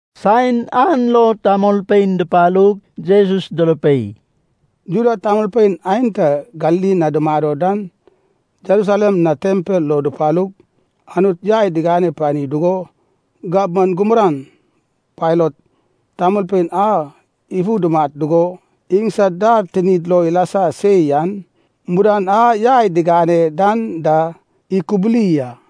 Saen an lo tamolpein dupalug Jesus durupei, “Juda tamolpein aenta Galili na dumado dan Jerusalem na tempel lo dupalug, Anut yai digane pani dugo gabman gurman, Pailat, tamolpein an ifu dumat dugo, iŋsad dar tinid lo ilasa se yan mudan a yai digane dan da ikubuli a.”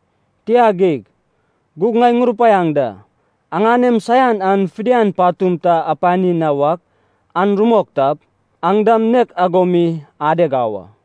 Tia geig. Gug ŋai ŋurupaiaŋ da. Aŋanem saian an fidian patum ta apani na wak an rumok tap, aŋ dam nek ago mi adeg au a.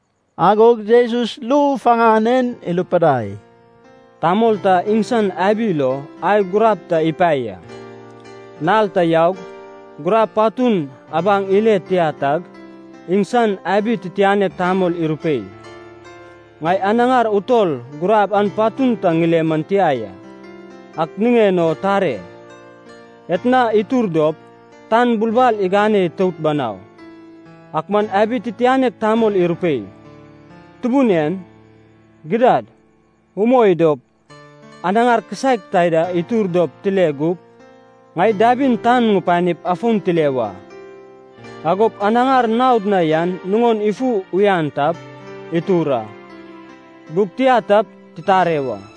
Agog Jesus ru faŋan en irupidai, “Tamol ta iŋsan abi lo ai gurab ta ipae ya. Nal ta yaug, gurab patun abaŋ ile tia tag, iŋsan abi titianek tamol irupei, ‘Ŋai anaŋar utol gurab an patun ta ŋile man tia ya. Ak niŋen o tare. Etna itur dop, tan bulbal iŋanep itout banau.’ Ak man abi titianek tamol irupei, ‘Tubun en. Gidad, umoi dop, anaŋar kisaek taida itur dop tile gup. Ŋai dabin tan ŋupanip afon tile wa. Agop, anaŋar naod na yan nuŋon ifu uyan tap, itur a. Gug tia tap, titare wa.’”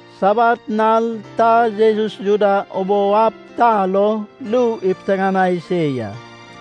Sabat nal ta Jesus Juda ubou ab ta lo ru ipiteŋanai se ya.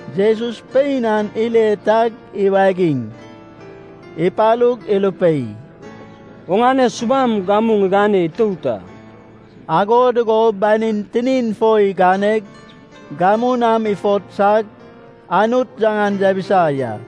Jesus pein an ile tag iwagig, ipalug irupei, “Oŋane subam gamu ŋigane itout a.” Ago dugo banin tinin fo iganeg, gamu nam ifotsag, Anut yaŋan yabisa ya.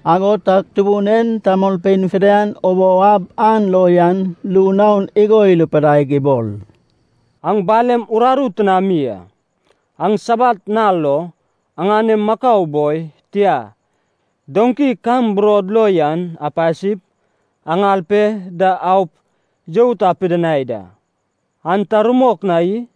Ago tag Tubun en tamolpein fidian ubou ab an lo yan ru naon igo irupidaig ibol, “Aŋ balem uraru tinami a! Aŋ Sabat nal lo, aŋanem makau boi, tia, doŋki kam burod lo yan apasip, aŋal pe da aup you ta apidinai da. An ta rumok na i?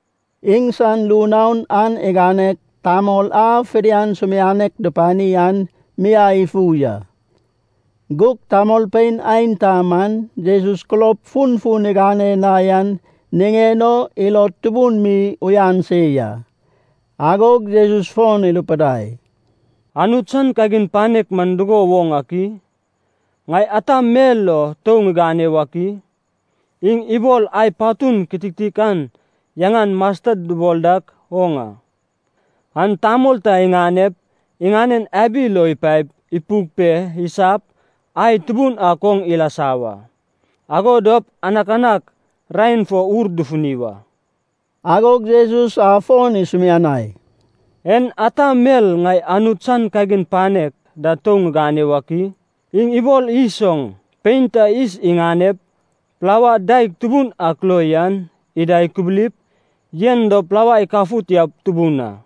Iŋsan ru naon an iganeg, tamol a fidian sumianek dupani an miai ifu ya. Gug tamolpein aenta man Jesus kulob funfun igane na yan niŋen o ilod tubun mi uyan se ya. Agog Jesus fon irupidai, “Anut san kagin panek man dugo woŋ ak i? Ŋai ata mel lo tou ŋigane wak i? Iŋ ibol ai patun kitiktikan yaŋan masted dubol dak oŋ a. An tamol ta iŋanep, iŋanen abi lo ipaep, ipuk pe, isap, ai tubun ak oŋ ilasa wa. Ago dop anakanak raen fo wur dufuni wa.” Agog Jesus afon isumianai, “En ata mel ŋai Anut san kagin panek da tou ŋigane wak i? Iŋ ibol yis oŋ. Pein ta yis iŋanep, plaua daeg tubun ak lo yan ida ikubulip, yen dop plaua ikafut yaup tubun a.”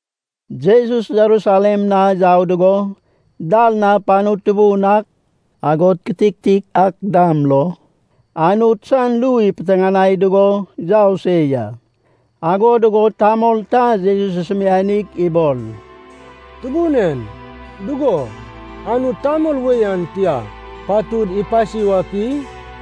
Jesus Jerusalem na yau dugo, dal na panu tutubun ak, agod kitiktik ak dam lo, Anut san ru ipiteŋanai dugo yau se ya. Ago dugo tamol ta Jesus isumianig ibol, “Tubun en, dugo, Anut tamol wei an tia patud ipasi wak i?”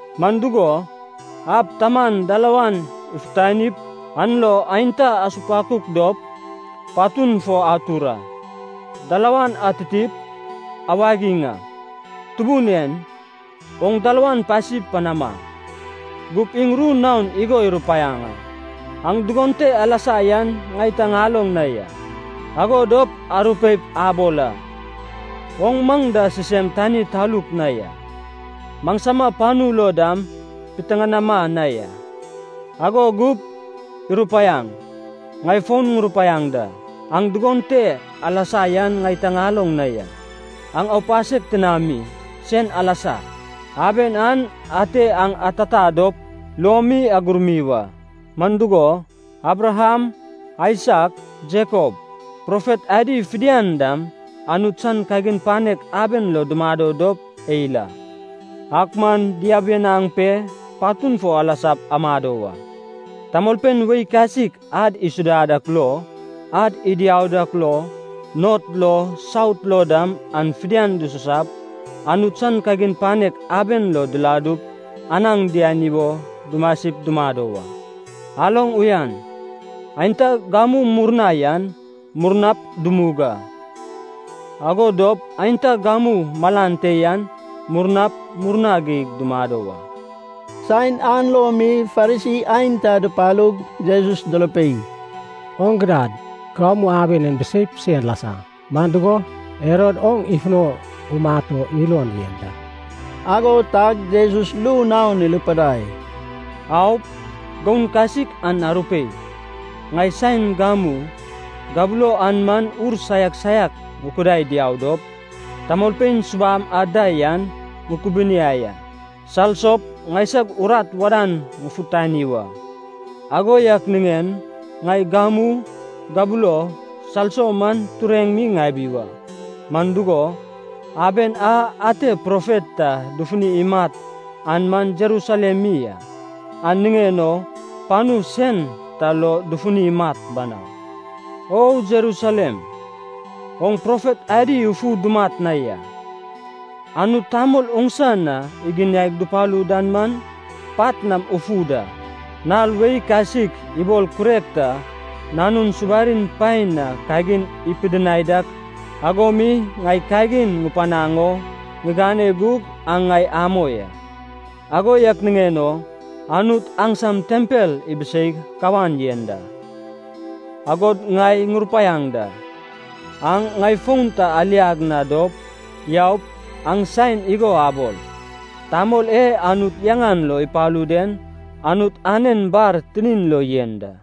Man dugo, ab taman dalawan ifutanip, an lo aenta asupakuk dop, patun fo atur a. Dalawan atitip, awagiŋ a, ‘Tubun en, oŋ dalawan pasi panama.’ “Gup iŋ ru naon igo irupaiaŋ a, ‘Aŋ dugon te alasa yan ŋai ta ŋaloŋ na ya.’ “Ago dop arupeip abol a, ‘Oŋ maŋ da sisem tani taluk na ya. Maŋsama panu lo dam piteŋanama na ya.’ “Ago gup irupaiaŋ, ‘Ŋai fon ŋurupaiaŋ da, aŋ dugon te alasa yan ŋai ta ŋaloŋ na ya. Aŋ aupasek tinami, sen alasa.’ “Aben an ate aŋ atata dop luomi agurmi wa, man dugo, Abraham, Aisak, Jekop, profet adi fidian dam Anut san kagin panek aben lo dumado dop eil a, ak man diabianaŋ pe patun fo alasap amado wa. Tamolpein wei kasik ad isuda dak lo, ad idiau dak lo, not lo, saut lo dam an fidian dususap, Anut san kagin panek aben lo diladup anaŋ diani wo dumasip dumado wa. Aloŋ uyan, aenta gamu murna yan murnap dumug a, ago dop aenta gamu malan te yan murnap murna geig dumado wa.” Saen an lo mi Farisi aenta dupalug, Jesus durupei, “Oŋ gidad, gamu aben en biseip sen lasa. Man dugo, Herod oŋ ifuno umat o ilon yen da.” Ago tag Jesus ru naon irupidai, “Aup, goun kasik an arupei, ‘Ŋai saen gamu, gabulo an man ur saiak saiak ŋukudai diau dop, tamolpein subam ad da yan ŋukubuniai a. Salsop ŋaisag urat wadan ŋufutani wa. Ago yak niŋen ŋai gamu, gabulo, salso man tureŋ mi ŋabi wa. Man dugo, aben a ate profet ta dufuni imat an man Jerusalem mi a, an niŋen o panu sen ta lo dufuni imat banau.’” “O Jerusalem. Oŋ profet adi ufu dumat na ya. Anut tamol oŋsa na iginiai dupalu dan dam pat nam ufu da. Nal wei kasik ibol kurek ta nanun subarin paen na kagin ipidinai dak ago mi ŋai kagin ŋupanaŋ o ŋigane gug aŋ ŋai amoi a! Ago yak niŋen o Anut aŋsam tempel ibiseig kawan yen da. Agod ŋai ŋurupaiaŋ da, aŋ ŋai fon ta aliag na dop yaup aŋ saen igo abol, ‘Tamol e Anut yaŋan lo ipalu den Anut anen bar tinin lo yen da.’”